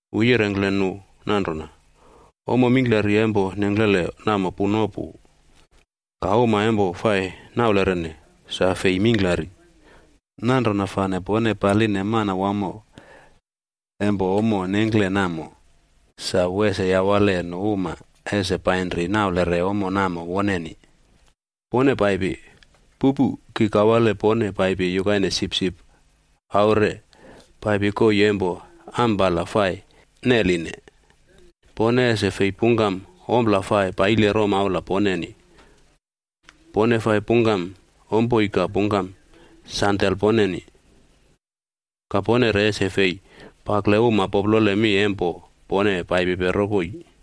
Wu yirengkle nu nanrona, “Ommo mingklari empo nengklele namo puno pu, ka uma empo fai naulerene, sa fei mingklari. Nanrona fane pone paline Manawamo empo ommo nengkle namo sa wu ese yawale nu uma ese painri naulere ommo namo woneni. Pone paipi! Pupu, ki kawale pone paipi yukaine sipsip aure paipi koii empo ampala fai neline. Pone ese fei pungkam ompla fai paile romaula poneni, pone fai pungkam ompoi ka pungkam sandel poneni. Ka pone re ese fei pakle uma poplole mi empo pone paipipe rokoi.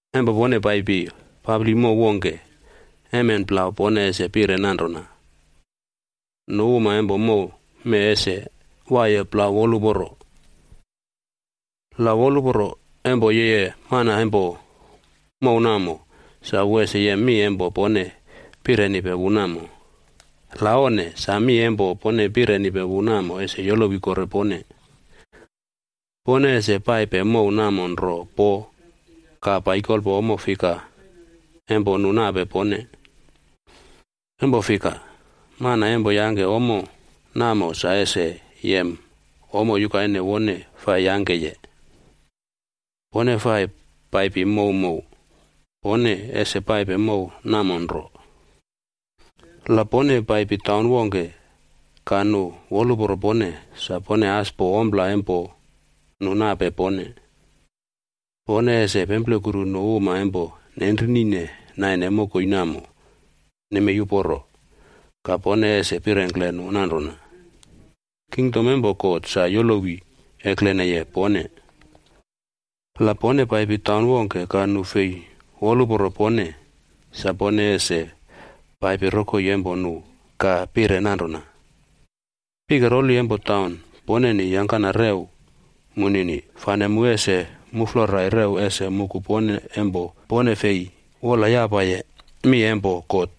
“Empo pone paipi papli mow wongke, emen plau pone ese pire nanrona, ‘Nu uma empo mow mee ese waiye plau woluporo!’ La woluporo empo yeye mana empo mow namo, sa wu ese yem mi empo pone pirenipe wu namo. La onne, sa mi empo pone pirenipe wu namo ese yolowi kore pone. Pone ese paipe mow namo nro po ka paikolpo ommo fika empo nu nape pone, empo fika, mana empo yangke ommo namo sa ese yem ommo yukaine wone fai yangkeye. Pone fai paipi mowmow, pone ese paipe mow namo nro. “La pone paipi taun wongke ka nu woluporo pone, sa pone as po ompla empo nu nape pone. Pone ese pemplekuru nu uma empo nenrinine naine mokoi namo nemei uporo, ka pone ese pirengkle nu nanrona, ‘Kingdom empo God sa yolowi ekleneye pone.’ La pone paipi taun wongke ka nu fei woluporo pone, sa pone ese paipi rokoi empo nu ka pire nanrona, ‘Pike roli empo taun poneni yangkana rew munini, fane mu ese muflorai rew ese muku pone empo pone fei wolyapaye mi empo God.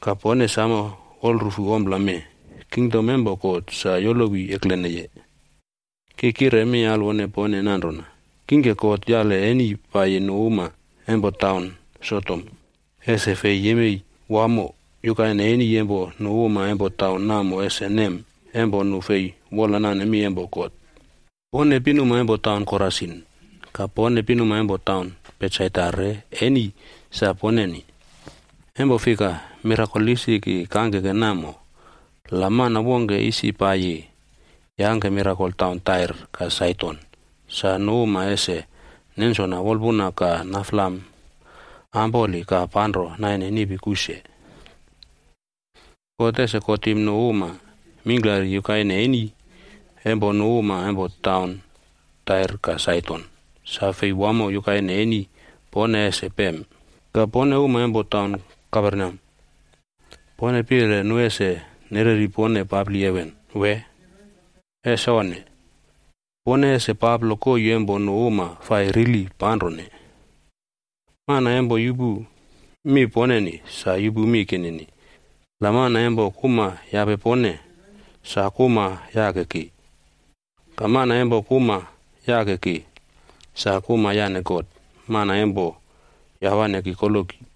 Ka pone samo wolrufu ompla mee, kingdom empo God sa yolowi ekleneye.’ Ki kire mi alwone pone nanrona, kingke God yale eni paiyi nu uma empo taun Sodom,b ese fei yemei wamo yukaine eni empo nu uma empo taun namo ese nem empo nu fei wolnane mi empo God. “Pone pinuma empo taun Korasin. Ka pone pinuma empo taun Betsaidac re eni sa poneni. Empo fika, mirakol isi ki kangkeke namo, la mana wongke isi paiyi yangke mirakol taun Tair ka Saidon,d sa nu uma ese nensona wolpuna ka naflam ampoli ka panro naine nipi kuse. God ese kotim nu uma mingklari yukaine eni empo nu uma empo taun Tair ka Saidon sa fei wamo yukaine eni pone ese pem. Ka pone uma empo taun Kaperneam, pone pire nu ese nereri pone papli heven, wee? Ese onne! Pone ese paplo koii empo nu uma fai rili panrone. “Mana empo yupu mi poneni, sa yupu mi kinini, la mana empo kuma yape pone, sa kuma yake ki. Ka mana empo kuma yake ki, sa kuma yane God, mana empo yawane ki koloki.”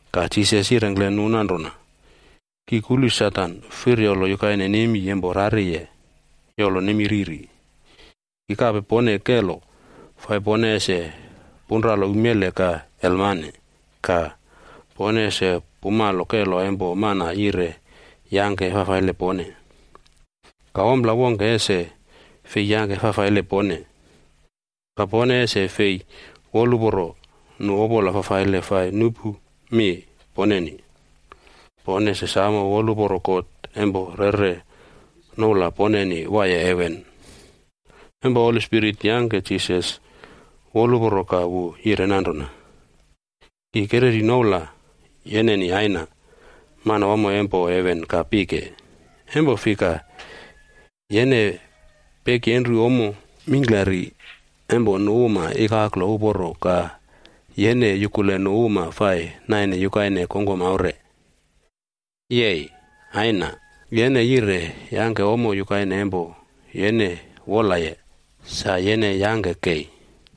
Ka Jisas yirengkle nu nanrona, “Ki kulu Satan firyolo yukaine nemi empo rariye yolo nemi riri. Ki kape pone kelo fai pone ese punralo umele ka elmane,e ka pone ese pumalo kelo empo mana yire yangke fafaile pone, ka ompla wongke ese fei yangke fafaile pone. Ka pone ese fei woluporo nu opola fafaile fai nupu mi poneni, pone ese samo woluporo God empo yeꞌre noula poneni waiye heven.” Empo Holi Spirit yangke Jisas woluporo ka wu yire nanrona, “Ki kereri noula yeneni Aina, Manawamo empo heven ka pike, empo fika yene pekyenru ommo mingklari empo nu uma ikaklo uporo ka yene yukule nu uma fai naine yukaine kongkom aure. Yei! Aina yene yire yangke ommo yukaine empo yene wolaye, sa yene yangke kei.”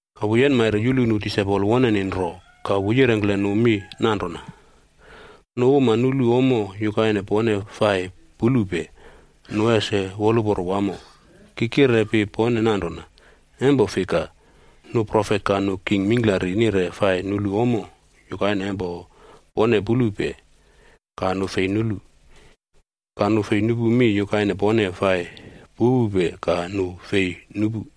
Ka wu yenmaire yulu nu disaipol woneni nro ka wu yirengkle nu mi nanrona, “Nu uma nulu ommo yukaine pone fai pulupe, nu ese woluporo wamo. Ki kirepi pone nanrona, empo fika, nu profet ka nu king mingklari nire fai nulu ommo yukaine empo pone pulupe, ka nu fei nulu. Ka nu nire nupu mi yukaine pone fai pupupe ka nu fei nupu.”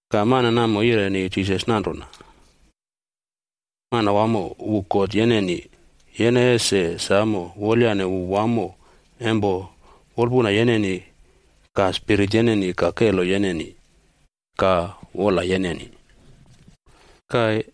Ka mana namo yireni Jisas nanrona, “ ‘Manawamo wu God yeneni, yene ese samo wolyane wu wamo empo wolpuna yeneni ka spirit yeneni ka kelo yeneni ka wola yeneni.’ Ka,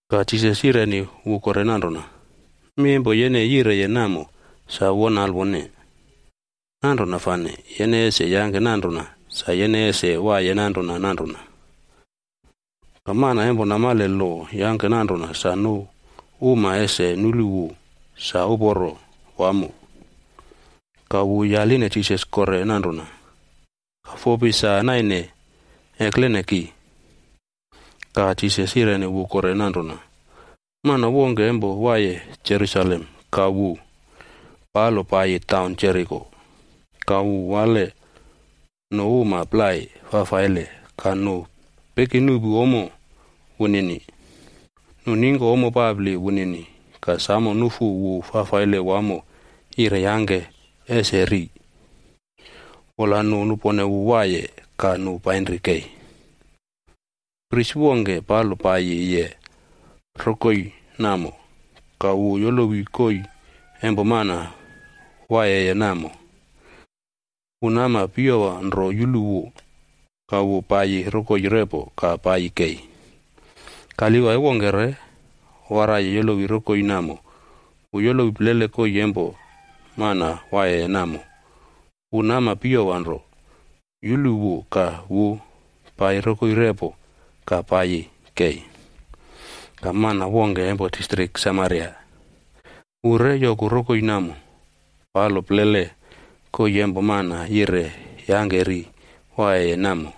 Ka Jisas yireni wu kore nanrona, “Mi empo yene yireye namo sa won alwone. Nanrona fane, yene ese yangke nanrona sa yene ese waiye nanrona nanrona.” Ka mana empo namale lo yangke nanrona sa nu uma ese nulu wu sa uporo wamo, ka wu yaline Jisas kore nanrona, “Ka fopi sa naine eklene ki?” Ka Jisas yireni wu kore nanrona, “Mana wongke empo waiye Jerusalem ka wu palo paiyi taun Jeriko. Ka wu wale nu uma plai fafaile ka nu pekinuꞌpu ommo wunini. Nu ningko ommo papli wunini ka samo nufu wu fafaile wamo yire yangke ese ri, wola nu nupone wu waiye ka nu painri kei. Pris wongke palo paiyiye rokoi namo, ka wu yolowi koii empo mana waiyeye namo, wu nama piyowa nro yulu wu ka wu paiyi rokoi repo ka paiyi kei. “Ka Livai wongke re waraiye yolowi rokoi namo wu yolowi plele koii empo mana waiyeye namo, wu nama piyowa nro yulu wu ka wu paiyi rokoi repo ka paiyi kei. Ka mana wongke empo Samariag wu re yoku rokoi namo, palo plele koii empo mana yire yangke ri waiyeye namo.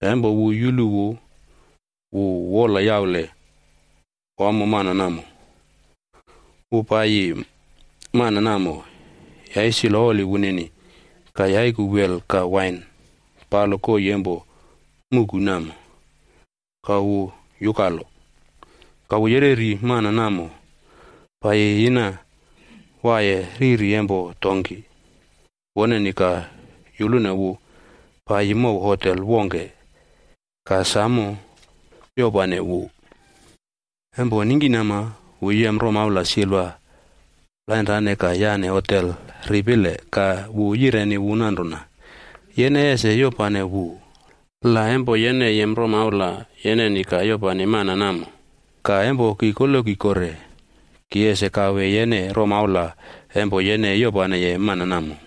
Ka empo wu yulu wu, wu wolyaule wamo mana namo. Wu paiyi mana namo yaisilo oli wunini, ka yaiku wel ka wain palo koii empo muꞌku namo, ka wu yukalo. Ka wu yereri mana namo paiyi yina waiye riri empo donkih woneni ka yulune wu paiyi mow hotel wongke ka samo yopane wu. Empo ningkinama wu yem romaula silva plainrane ka yane hotel ripile ka wu yireni wu nanrona, ‘Yene ese yopane wu. La empo yene yem romaula yeneni ka yopane mana namo, ka empo ki koloki kore, ki ese kawe yene romaula empo yene yopaneye mana namo.’”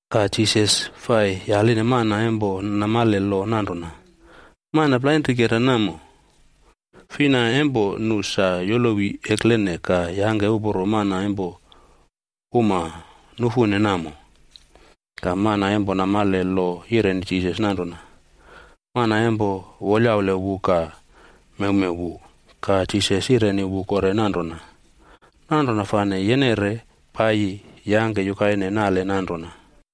Ka Jisas fai yaline mana empo namale lo nanrona, “Mana plainrikera namo, fina empo nu sa yolowi eklene ka yangke uporo mana empo uma nufune namo?” Ka mana empo namale lo yireni Jisas nanrona, “Mana empo wolyaule wu ka mewmew wu.” Ka Jisas yireni wu kore nanrona, “Nanrona fane yene re paiyi yangke yukaine nale nanrona.”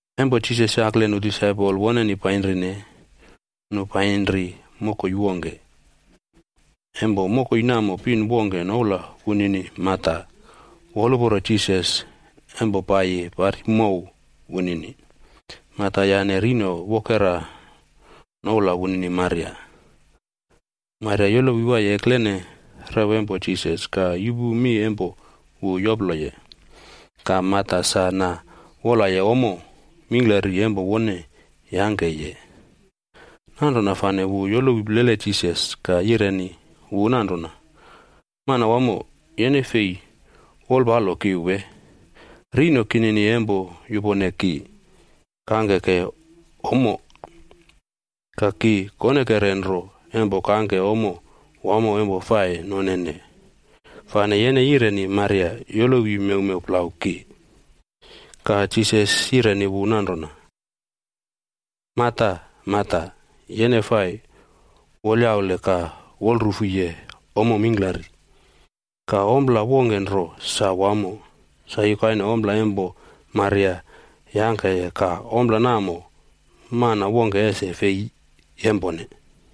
Empo Jisas yakle nu disaipol woneni painrine, nu painri mokoi wongke. Empo mokoi namo pin wongke noula wunini Marta woluporo Jisas empo paiyi pari mow wunini. Marta yane pinmela woneni noula Maria. Maria yolowi waiye eklene rew empo Jisas ka yupu mi empo wu yoploye. Ka Marta sa na wolaye ommo mingklari empo wone yangkeye, nanrona fane wu yolowi plele Jisas ka yireni wu nanrona, “Manawamo, yene fei wolpalo ki wee? Rino kinini empo yupone ki kangkeke ommo. Ka ki konekere nro empo kangke ommo wamo empo fai nonene, fane yene yireni Maria yolowi mewmew plau ki.” Ka Jisas yireni wu nanrona, “Marta, Marta, yene fai wolyaule ka wolrufuye ommo mingklari. Ka ompla wongke nro sa wamo, sa yukaine ompla empo Maria yangkeye ka ompla namo mana wongke ese fei yempone.”